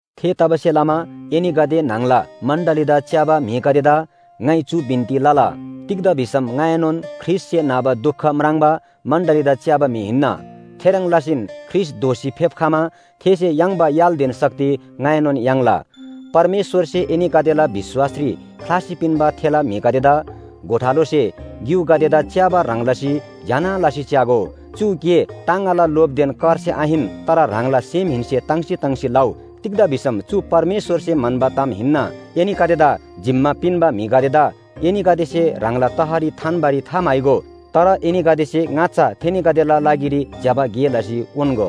थेतबासेलमा एनीगदे न्‍हङला मण्‍डलीदा च्‍याबा म्‍हिगदेदा ङाइ चु बिन्‍ती लला। तिग्‍दा भिसम ङाएनोन ख्रीष्‍टसे नाबा दुख म्राङ्बा मण्‍डलीदा च्‍याबा म्‍हि हिन्‍ना। थेह्रङ् लसीन ख्रीष्‍ट दोःसी फेप्‍खमा थेसे याङ्बा य्‍हालदेन शक्ति ङाइनोन याङ्ला। परमेश्‍वरसे एनीगदेला विश्‍वासरी ख्‍लासी पिन्‍बा थेला म्‍हिगदेदा गोठालोसे ग्‍युगदेदा च्‍याबा ह्रङ् लसी ज्‍यना लसी च्‍यागो। चु गे टाङगाला लोभदेन करसे आहिन, तर ह्राङला सेमहेन्‍से ताङ्सी ताङ्सी लउ। तिग्‍दा भिसम चु परमेश्‍वरसे म्‍हन्‍बा ताम हिन्‍ना। एनीगदेदा जिम्‍मा पिन्‍बा म्‍हिगदेदा एनीगदेसे ह्राङला तहरी थान्‍बारी थाम्‍हाइगो। तर एनीगदेसे ङाच्‍छा थेनीगदेला लागिरी ज्‍यबा गे लसी उन्‍गो।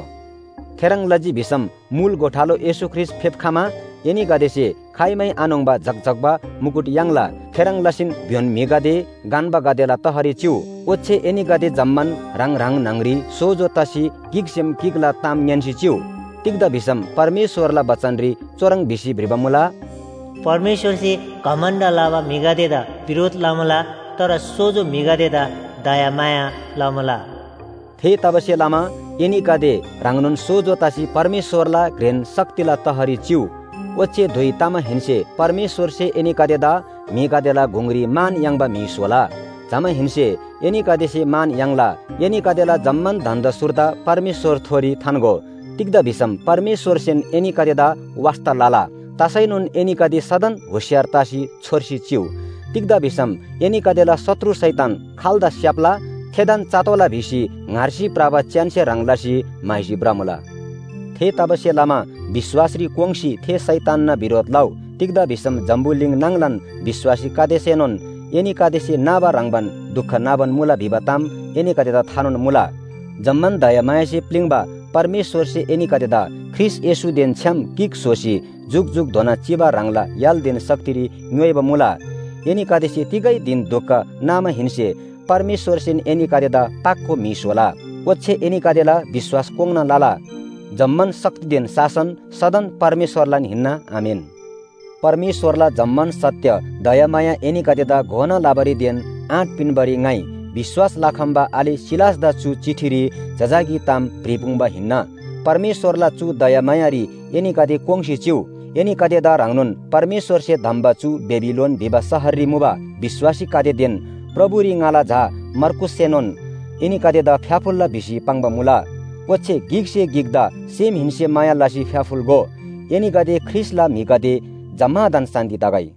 थेह्रङ् लजी भिसम मुल गोठालो येशू ख्रीष्‍ट फेप्‍खमा एनीगदेसे खाइमै आन्‍होङ्बा झक्‍झक्‍बा मुकुट याङ्ला। थेह्रङ् लसीन भ्‍योन म्‍हिगदे गन्‍बागदेला तहरी चिउ। ओच्‍छे एनीगदे जम्‍मान ह्राङ ह्राङ न्‍हङरी सोजो तसी गिकसेम गिकला ताम ङ्‌यान्‍सी चिउ। तिग्‍दा भिसम परमेश्‍वरला बचनरी चुह्रङ् भिसी भ्रिबा मुला, “परमेश्‍वरसे घमण्‍ड लबा म्‍हिगदेदा बिरोध लमुला, तर सोजो म्‍हिगदेदा दयामाया लमुला।” थेतबासेलमा एनीगदे ह्राङनोन सोजो तसी परमेश्‍वरला घ्रेन शक्तिला तहरी चिउ। ओच्‍छे धुइ तमाहेन्‍से परमेश्‍वरसे एनीगदेदा म्‍हिगदेला गुङरी मान याङ्बा म्‍हि स्‍होला। जमाहेन्‍से एनीगदेसे मान याङ्ला। एनीगदेला जम्‍मान धन्‍दा सुर्दा परमेश्‍वरथोरी थान्‍गो। तिग्‍दा भिसम परमेश्‍वरसेन एनीगदेदा वास्‍ता लला। तसैनोन एनीगदे सदन होशियार तसी छोर्सी चिउ। तिग्‍दा भिसम एनीगदेला शत्रु शैतान खाल्‍दा स्‍याप्‍ला थेदान चतोःला भिसी ङ्‌हार्सी भ्रबा च्‍यानसे ह्रङ् लसी म्‍हाइसी भ्रमुला। थेतबासेलमा विश्‍वासरी कोङ्‌सी थे शैतानना बिरोध लउ। तिग्‍दा भिसम जम्‍बुलिङ नाङलान विश्‍वासीगदेसेनोन एनीगदेसे नाबा ह्रङ्‌बान दुख नाबान मुला भिबा ताम एनीगदेदा थानोन मुला। जम्‍मान दयामायासे प्‍लिङ्बा परमेश्‍वरसे एनीगदेदा ख्रीष्‍ट येशूदेन छ्‌याम गिक स्‍होसी जुकजुकधोना चिबा ह्राङला य्‍हालदेन शक्तिरी ङ्‌योइबा मुला। एनीगदेसे तिगै धिन दुख नामाहेन्‍से परमेश्‍वरसेन एनीगदेदा पाको म्‍हि स्‍होला, ओच्‍छे एनीगदेला विश्‍वास कोङ्‌ना लला। जम्‍मान शक्तिदेन शासन सदन परमेश्‍वरलान हिन्‍ना। आमेन। परमेश्‍वरला जम्‍मान सत्‍य दयामाया एनीगदेदा घोना लबारीदेन आँट पिन्‍बारी ङाइ विश्‍वास लखम्‍बा आले सिलासदा चु चिठीरी जजाकी ताम भ्रिपुङ्बा हिन्‍ना। परमेश्‍वरला चु दयामायारी एनीगदे कोङ्‌सी चिउ। एनीगदेदा ह्रङ्नोन परमेश्‍वरसे धम्‍बा चु बेबिलोन भिबा शहररी मुबा विश्‍वासीगदेदेन प्रभुरी ङाला झा मर्कूससेनोन एनीगदेदा फ्‍याफुल्‍ला भिसी पाङ्बा मुला। ओच्‍छे गिकसे गिकदा सेमहेन्‍से माया लसी फ्‍याफुल्‍गो। एनीगदे ख्रीष्‍टला म्‍हिगदे जम्‍मादान शान्‍ति तगै।